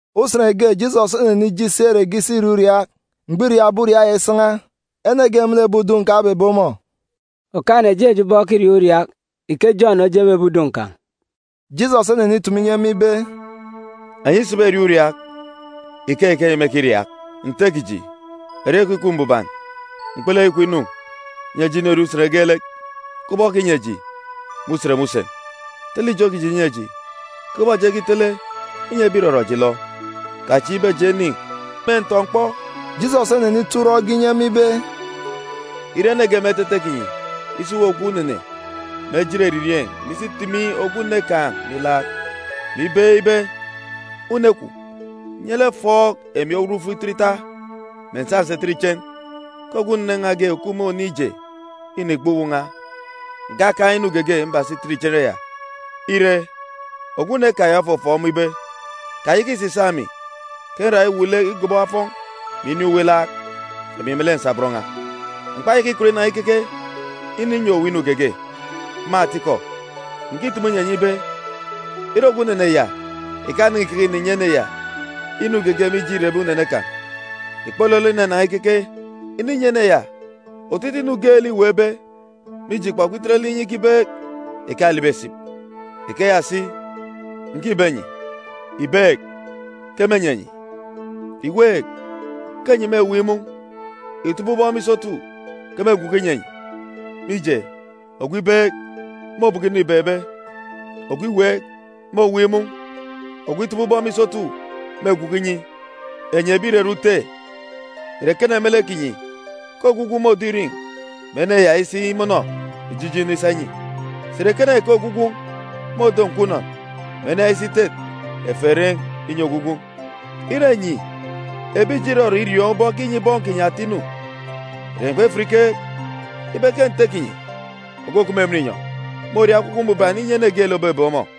Usen ge Jisọs onenije isi ere ge isi iriaak uriaak. Mgbọ îriaakbe uriaak ya isan̄a, ene ge me lek ebi udun̄ kan̄ obebe ọmọ, “Okaan̄-ene jeen̄ eji ubọk ekiriaak uriaak, ike Jọn ojeen̄be ebi udun̄ kan̄.” Jisọs onenitumu inyi ema ibe, “Enyi isiberiaak uriaak, ikeyi ke enyi mêkiriaak: “Nte kiji, erieen̄ kwun̄ ikup mbuban. Mkpulu kwun̄ inu. Nyi eji inorie usen geelek, kubọk okinyi eji me usen me usen. Tele ijo kiji nyi eji, kubọk eji ekitele inyi ebi ìrọrọ eji ilọ. Kachieek ibe eji enin̄ me ntọ-mkpọ.” Jisọs onenito urọk ge inyi ema ibe, “Ire ene ge me etete kinyi isi uwu ogwu unene me ejit eririeen̄, mè isi itimi ogwu une kan̄ me ilaak, mè ibeek ibe, ‘Une kwun̄, nye lek fọọk emi owut fituru ita, mè ǹsa ǹsi ǹtet ichen, ke ogwu unene n̄a ge òkup me oniin̄ ije înigba uwu n̄a. Ǹkakaan̄ inu geege mbasa itet ichen ya.’ “Ire, ogwu une kan̄ ya ofọfọọk ọmọ ibe, ‘Kayaka ìsisaak emi ke nra iwuuk lek igọbọ afọn̄, mè inin̄ uwu ilaak, emi melek nsabọn n̄a. M̀kpayaka ikọt inan̄a ikeke ininyi owu inu geege.’ Me atikọ, ǹkitumu inyi enyi ibe, ire ogwu unene ya ìkanan̄a ìkeke ìninyi ene ya inu geege mije îrebe unene kan̄, ìkpolọlọ inanan̄a ikeke ininyi ene ya otutuuk inu geelek îweekbe, mije îkpọkpọ itet lek inye ikibeek, ìkalibi esip. “Ikeya si, ǹkibe enyi: Ìbeek, ke mênyi enyi. Ìweek, ke enyi mêweek imun̄. Ìtọbọ ubọk me isotu, ke mêgwuku inyi enyi. Mije, ogwu ibeek, môbọkọ inu îbeekbe. Ogwu iweek, môweek imun̄. Ogwu itọbọ ubọk me isotu, mêgwuku inyi. “Enyi ebi ìrere ute, ìre ekene me lek kinyi ke ogwu gwun̄ môdo irin̄, mè ene ya isi imọnọ ijijinu isa inyi? Sà ìre ekene ke ogwu gwun̄ môdo nkwa unọn, mè ene ya isi itet eferen̄ inyi ogwu gwun̄? Ire enyi ebi ijo irọrọ iriọọn̄ ubọk ekinyi bọn kinyi ata inu, ìre enyi kpefat ikeek ibe ke Nte kinyi ogwu òkup me emen inyọn̄ môria Ekwukwu Mbuban inyi ene geelek òbebeek ọmọ?”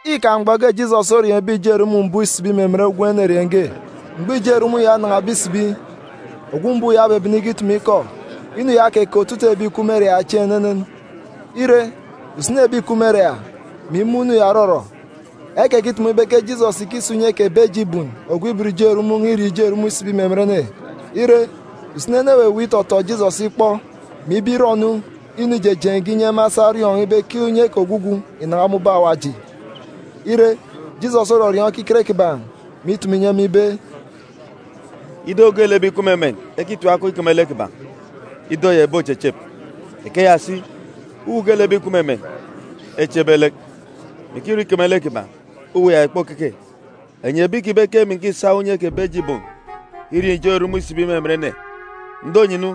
Îkaan̄ mgbọ ge Jisọs orieen̄be ijo erumun̄ mbuuk isibi me emen gwun̄ enerieen̄ ge. Mgbọ ijo erumun̄ ya onan̄abe isibi, ogwu mbuuk ya obebene ikitumu ikọ. Inu ya okeke otutuuk ebi ìkup me ere ya chieen̄ enenen. Ire, usini ebi ìkup me ere ya, mè imun̄ inu ya òrọrọ ekekitumu ibe ke Jisọs ìkisa unye kè Bejibun, ogwu ibot ijo erumun̄, irieen̄ ijo erumun̄ isibi me emen ene. Ire, usini ene eweweek itọtọ Jisọs ikpọ, mè ibe irọ-nu inu ijejeen̄ ge, inyi ema esa eriọọn̄ ibe ke unye ke ogwugwu ìnan̄a me ubọk Awaji. Ire, Jisọs orọriọọn̄ ekiket kiban̄, mè itumu inyi ema ibe, “Ido geelek ebi ìkup me emen ekitim akọn̄ ikeme lek kiban̄, ido ya ìbochechep. Ikeya si, uwu geelek ebi ìkup me emen echebe lek, mè ikirọ ikeme lek kiban̄, uwu ya ìkpokeke. Enyi ekibe ke emi ǹkisa unye kè Bejibun irieen̄ ijo erumun̄ isibi me emen ene. Ǹdo-nu enyi,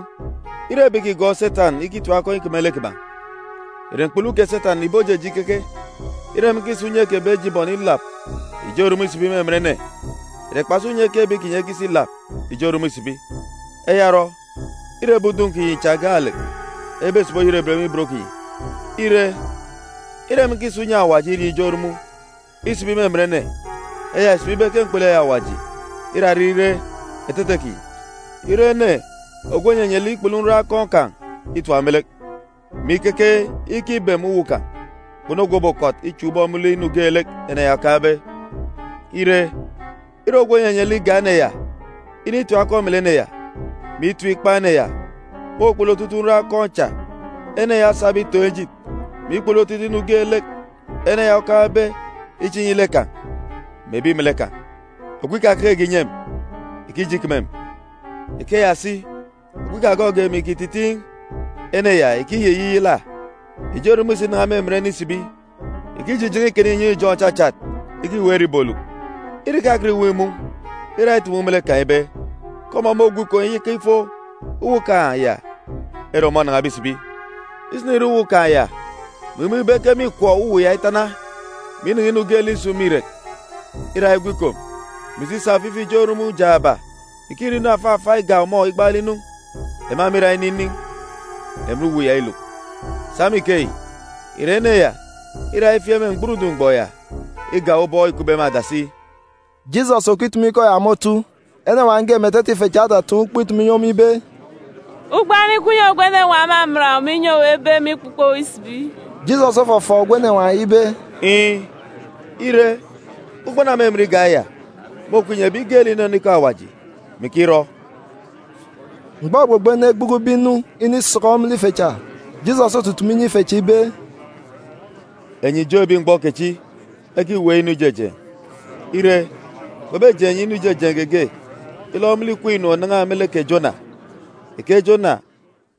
ire ebi ìkigọọk Setan ikitim akọn̄ ikeme lek kiban̄, ìre mkpulu kè Setan ìbojeje ikeke? Ire emi nkisa unye kè Bejibun ilap ijo erumun̄ isibi me emen ene, ìre kpasi unye ke ebi kinyi ekisa ilap ijo erumun̄ isibi? Eya orọ, îre ebi udun̄ kinyi cha gaalek ebesibi oyerebet me ibot kinyi. Ire, ire emi ǹkisa unye Awaji irieen̄ ijo erumun̄ isibi me emen ene, eya ìsibi ibe ke mkpulu eyi Awaji îra ire etete kinyi. “Ire ene ogwu ònyenye lek ikpulu nroon̄ akọn̄ kan̄ itap me lek, mè ikeke ikibem uwu kan̄, kpunu ogwu òbokọt ichak ubọk me lek inu geelek ene ya okaan̄be. Ire, ire ogwu ònyenye lek igak ene ya initim akọn̄ me lek ene ya, mè itim ikpan̄ ene ya, môkpulu otutuuk nroon̄ akọn̄ cha ene ya osabe itoon̄ ejit, mè ikpulu otutuuk inu geelek ene ya okaan̄be iche inyi lek kan̄ mè ebi melek kan̄. “Ogwu ikakekege ìnyi emi ìkijeje ikeme emi. Ikeya si, ogwu ikagọọkge emi ìkititiin̄, ene ya ìkiyiyiyala. “Ijo erumun̄ isinan̄a me emen ene isibi, ìkijijen̄e ikana inyọn̄ ijọn̄ òchachat ikiweek ere ìboluk. Ire ìkakọt ìweek ìmun̄, îra itumu me lek kan̄ ibe ke ọmọ môgwu ikom iyaka ifo uwu kan̄ ya ere ọmọ onan̄abe isibi. Isinire uwu kan̄ ya, mè imun̄ ibe ke mîchan uwu ya itana, mè inen̄e inu geelek isun̄ me irek, îra igwu ikom, mè isi isa ofifi ijo erumun̄ jaaba ìkirọ inu afa afa igak ọmọ igbaalek inu. Ema mîra ininin̄ emen uwu ya iluk. Sa me ikeyi, irek ene ya îra ifieek me mgburudun̄ mgbọ ya igak ubọk îkupbe me adasi.” Jisọs òkitumu ikọ ya me otu, enenwaan̄ ge me etete ife cha otataan̄ ukpo itumu inyi ọmọ ibe, “Ugbana ikup inyi ogwu enenwaan̄ òmaman owu, mè inyi owu ebe, mè ikpukpo owu isibi.” Jisọs ofọfọọk ogwu enenwaan̄ ya ibe, “Iin̄, ire, ugbana òmimin igak eya môkup inyi ebi geelek ìnọnọ ikọ Awaji, mè ikirọ.” Mgbọ ogbogbo ene egbukube inu inisọkọ me lek ife cha, Jisọs otutumu inyi ife cha ibe, “Enyi ijo ebi mgbọ kechi ekiweek inu ijejeen̄. Ire, kpebejeen̄ enyi inu ijejeen̄ geege ilọ me lek ikween̄ inu ònan̄a me lek kè Jona. Ike Jona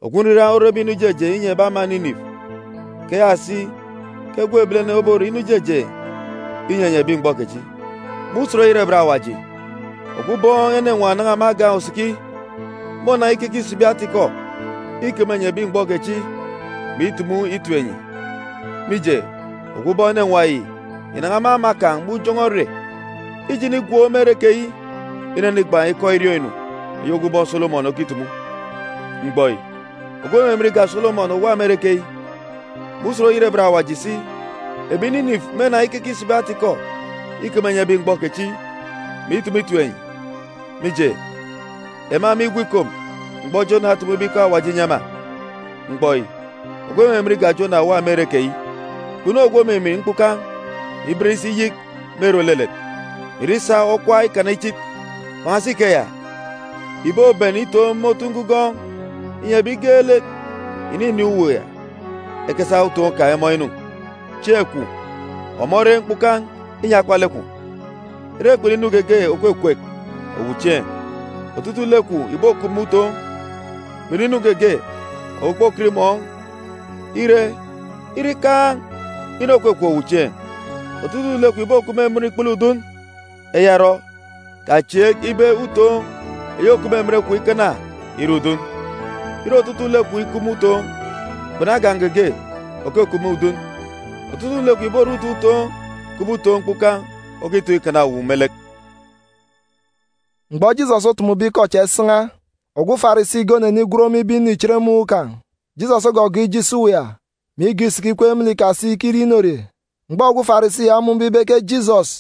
ogwu nriran orebe inu ijejeen̄ inyi ebi ama Ninife, ikeya si ke Gwun̄ Ebilene obore inu ijejeen̄ inyi enyi ebi mgbọ kechi. Me Usen Oyerebet Awaji, ogwu Ubọọn̄ Enenwaan̄ ònan̄a me Agan̄ Osikia mônan̄a ikeke isibi ata-ikọ ikeme enyi ebi mgbọ kechi, mè itumu itip enyi. Mije, ogwu ubọọn̄ enenwaan̄ yi ìnan̄a me ama kan̄ me ujọn̄ọ ere ije inigwook me ere keyi inenigban̄ ikọ iriọọn̄-inu eyi ogwu ubọọn̄ Solomọn okitumu. Mgbọ yi, ogwu òmimin igak Solomọn òwa me ere keyi. Me Usen Oyerebet Awaji si, ebi Ninife mênan̄a ikeke isibi ata-ikọ ikeme enyi ebi mgbọ kechi, mè itumu itip enyi. Mije, ema mîgwu ikom mgbọ Jona otumube ikọ Awaji inyi ema.b Mgbọ yi, ogwu òmimin igak Jona òwa me ere keyi. “Kpunu ogwu òkimin mkpukan̄, mè iben isi iyik me ere òlelet, mè ìre isa okwa ikana ichit. Kpan̄asi ikeya, ìboben itoon̄ me otu ngugọọn̄, inyi ebi geelek ìninin̄ uwu ya ekesa utoon̄ kan̄ emọọn̄ inu. Chieen̄ kwun̄, ọmọ ore mkpukan̄ inyi akpalek kwun̄. Ire kpunu inu geege òkwekwek owu chieen̄, otutuuk lek kwun̄ ìbokup me utoon̄, kpunu inu geege owu òkpokọt imọọn̄. Ire, ire ikaan̄ inu òkwekwek owu chieen̄, otutuuk lek kwun̄ ìbokup me emen ikpele udun. Eya orọ, kachieek ibe utoon̄ eyi òkup me emen kwun̄ ikana ire udun. Ire otutuuk lek kwun̄ ikup me utoon̄, kpunu agan̄ geege òkukup me udun, otutuuk lek kwun̄ ìbore utoon̄ utoon̄, kubọk utoon̄ mkpukan̄ okitoon̄ ikana owu me lek.” Mgbọ Jisọs otumube ikọ cha isan̄a, ogwu Farisi ge onenigwen ọmọ ibe inu ichen me uwu kan̄. Jisọs ogọgọọk ije isi uwu ya, mè igọọk isiki ikweek me lek ikasi ikirie inorie. Mgbọ ogwu Farisi ya omun̄be ibe ke Jisọs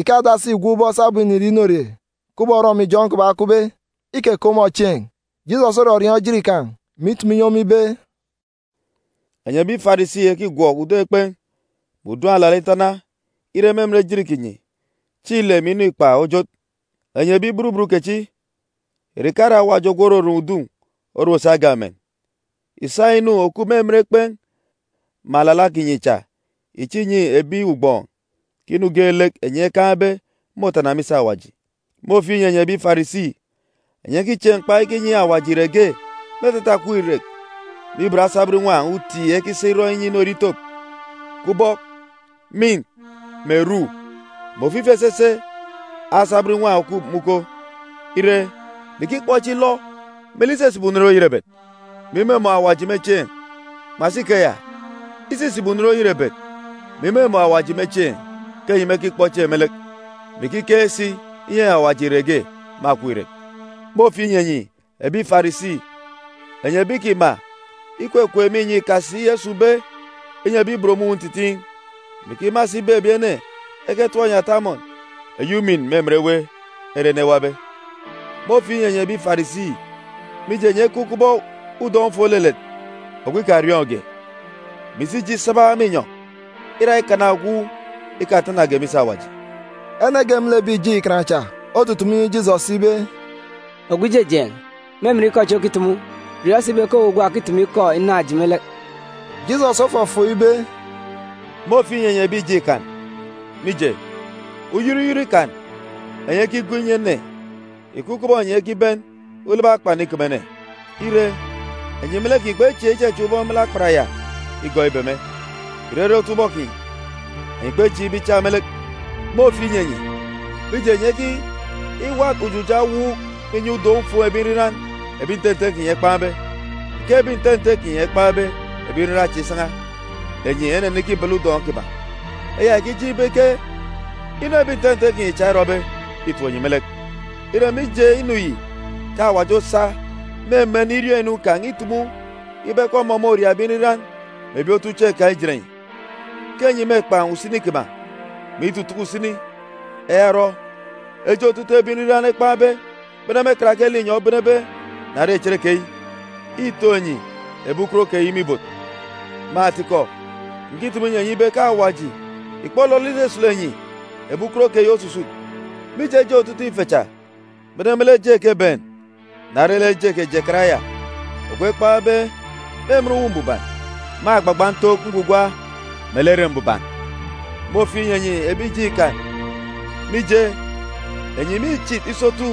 ìkadasi ìgwọk ubọk sabum înirie inorie, kubọk orọmijọn̄ kiban̄ okupbe, ikeke ọmọ chieen̄. Jisọs orọriọọn̄ ejit kan̄, mè itumu inyi ọmọ ibe, “Enyi ebi Farisi ekigwọk udun̄ ekpen̄ mè udun̄ alala itana, ire, me emen ejit kinyi, chieen̄ ile mè inu ikpak ojot. Enyi ebi burubut kechi! Ìre ìkare Awaji ogwu òrorom udun̄ orom si agan̄ emen? Ìsa inu òkup me emen ekpen̄ mè alala kinyi cha ìche ìnyi ebi ugbọọn̄, ke inu geelek enyi ekaan̄be môtana me isi Awaji. “Môfieek inyi enyi ebi Farisi! Enyi ekichieek mkpa ikinyi Awaji irek ge me etete akọp irek me ibot asabọn inwan̄ uti ekisa irọ inorie itop, kubọk mînt, mè rû, mè ofifi esese asabọn inwan̄ òkup me uko, ire, mè ikikpọ chieen̄ ilọ me lek isisibi unen oyerebet, mè imumun̄ Awaji me chieen̄. Kpan̄asi ikeya, isisibi unen oyerebet, mè imumun̄ Awaji me chieen̄ ke enyi mekikpọ chieen̄ me lek, mè ikikeek si inyinyi Awaji irek ge me akọp irek. “Môfieek inyi enyi ebi Farisi! Enyi ebi ìkima ikwekweek me inyọn̄ ikasi esun̄be inyi ebi ibot me uwu ntitiin̄, mè ikima si ibe ebi ene eketọp enyi ata amọn eyi umin me emen ewe ere ene ewabe. “Môfieek inyi enyi ebi Farisi, mije enyi ekup kubọk udọn̄-ufuun̄ òlelet. Ogwu ikariọọn̄ge, mè isi ije isaba me inyọn̄, îra ikana ogwu ikatanage me isi Awaji.” Ene ge me lek ebi ìjeen̄ Ikan cha otutumu inyi Jisọs ibe, “Ogwu Ijejeen̄, me emen ikọ chi okitumu, riọọn̄ si ibe ke owu gwa òkitumu ikọ inaan̄ eji me lek.” Jisọs ofọfọọk ibe, “Môfieek inyi enyi ebi ìjeen̄ Ikan, mije, uyọt uyọt ikan enyi ekigo inyi ene ìkup kubọk enyi ekiben ulobo akpan ikeme ene. Ire, enyi me lek kinyi kpechieek ichachak ubọk me lek akpan ya igọọk ibeme. Ìrere otubọk kinyi, enyi kpechieek ibe ichak me lek. “Môfieek inyi enyi, mije, enyi ekiwat ujuja ewuuk me inyọn̄ udọn̄-ufuun̄ ebi nriran ebi nte nte kinyi ekpan̄be. Ike ebi nte nte kinyi ekpan̄be ebi nriran cha isan̄a, enyi enenikibala udọn̄ kiban̄, eya ìkijeen̄ ibe ke inu ebi nte nte kinyi cha erọbe îtop enyi me lek. Îre mije inu yi ke Awaji osa me emen iriọọn̄-inu kan̄ itumu ibe ke ọmọ môria ebi nriran mè ebi otuchieen̄ kan̄ ijet enyi; ke enyi mêkpan̄ usini kiban̄, mè itutuku usini. Eya orọ, eje otutuuk ebi nriran ekpan̄be, bene me karake linyọn̄ obenebe na re cherekeyi, ìtoon̄ enyi ebi ukot keyi me ibot. Me atikọ, ǹkitumu inyi enyi ibe ke Awaji ìkpolọlọ isusulu enyi ebi ukot keyi osusut, mije eje otutuuk ife cha, bene me lek eje kè Ebenc na re lek eje kè Jekarayad ogwu ekpan̄be me emen Uwu Mbuban, me agbagba ntook ngwugwa melek Ere Mbuban. “Môfieek inyi enyi ebi ìjeen̄ Ikan, mije, enyi mîchit isotu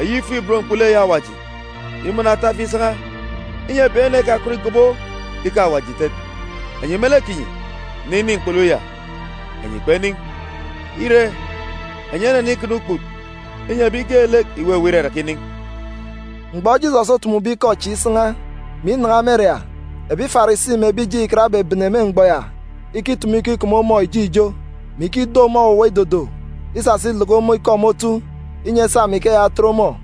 eyi ifuk-ibot mkpulu eyi Awaji, mè imọnọ atafi isan̄a, inyi ebi ene ekakọt ìgobo Ikọ Awaji ìtet. Enyi me lek kinyi, ninin̄ mkpulu ya, enyi kpenin̄, ire, enyi enenikana ukput inyi ebi geelek ìweweek iraraka inin̄.” Mgbọ Jisọs otumube ikọ chi isan̄a, mè inan̄a me ere ya, ebi Farisi mè ebi ìjeen̄ Ikan ebebene me mgbọ ya ikitumu ikọ ikeme ọmọ ijo ijo, mè ikido ọmọ owuwa idodo, isasa ileke ọmọ ikọ me otu, inyi esa me ikeya etet ọmọ.